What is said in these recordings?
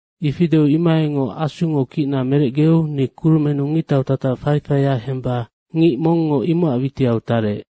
Ifi deu imohaingoc Asungo kicna merecgeu ni kurumennu ngictau tatac faifaia hemba ngic mongngo imocac witiau tarec,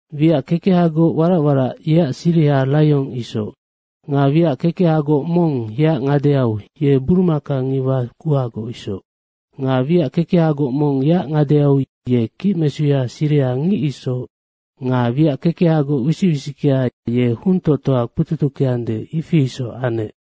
Wiac kekehagoc warac warac, yeac siriha raiong isoc. Nga wiac kekehagoc mong yeac ngadeau, ye burumaka ngiwa kuhagoc isoc. Nga wiac kekehagoc mong yeac ngadeau ye kicmesuya siriha ngic isoc nga wiac kekehagoc wisic wisickea, ye huntoctoa kpututuckeande, ifi isoc anec.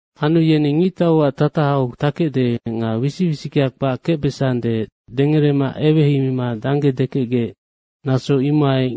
Anu wiac kekecnginagoc yeni ngictauac tatahau takecde nga wisic wisickea kpac kecbesande, dengerema eweheimima dangge dekecgec, naso imohai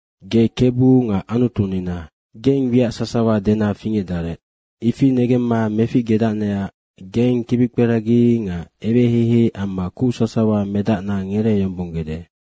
“Ge Kebu nga Anutunina. Geng wiac sasawa dena fingecdarec. Ifi negemma meficgedacnecac geng kibikperagi nga eweheihei amma kuc sasawa medacna ngereeyombonggede.”